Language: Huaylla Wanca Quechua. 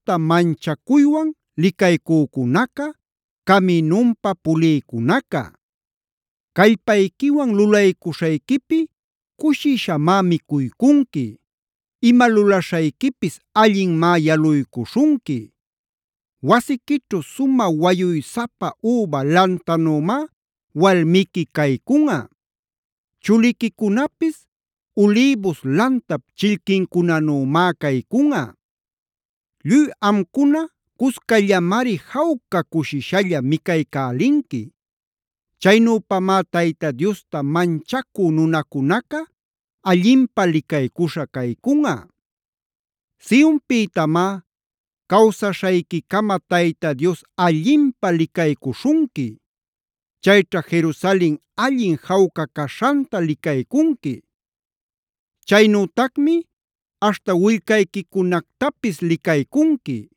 manchacuywan licaycücunaca, caminunpa pulïcunaca. Callpayquiwan lulaycuśhayquipi cushishamá micuycunqui. Ima lulaśhayquipis allinmá yaluycuśhunqui. Wasiquićhu sumä wayuysapa üba lantanümá walmiqui caycunꞌa. Chuliquicunapis ulïbus lantap chillquincunanümá caycunꞌa. Lluy amcuna cuscallamari jawca cushishalla micaycälinqui. Chaynüpamá Tayta Diosta manchacü nunacunaca allinpä licaycuśha caycunꞌa. ¡Sionpïtamá cawsaśhayquicama Tayta Dios allinpä licaycuśhunqui! Chayćha Jerusalen allin jawca caśhanta licaycunqui. Chaynütacmi aśhta willcayquicunactapis licaycunqui.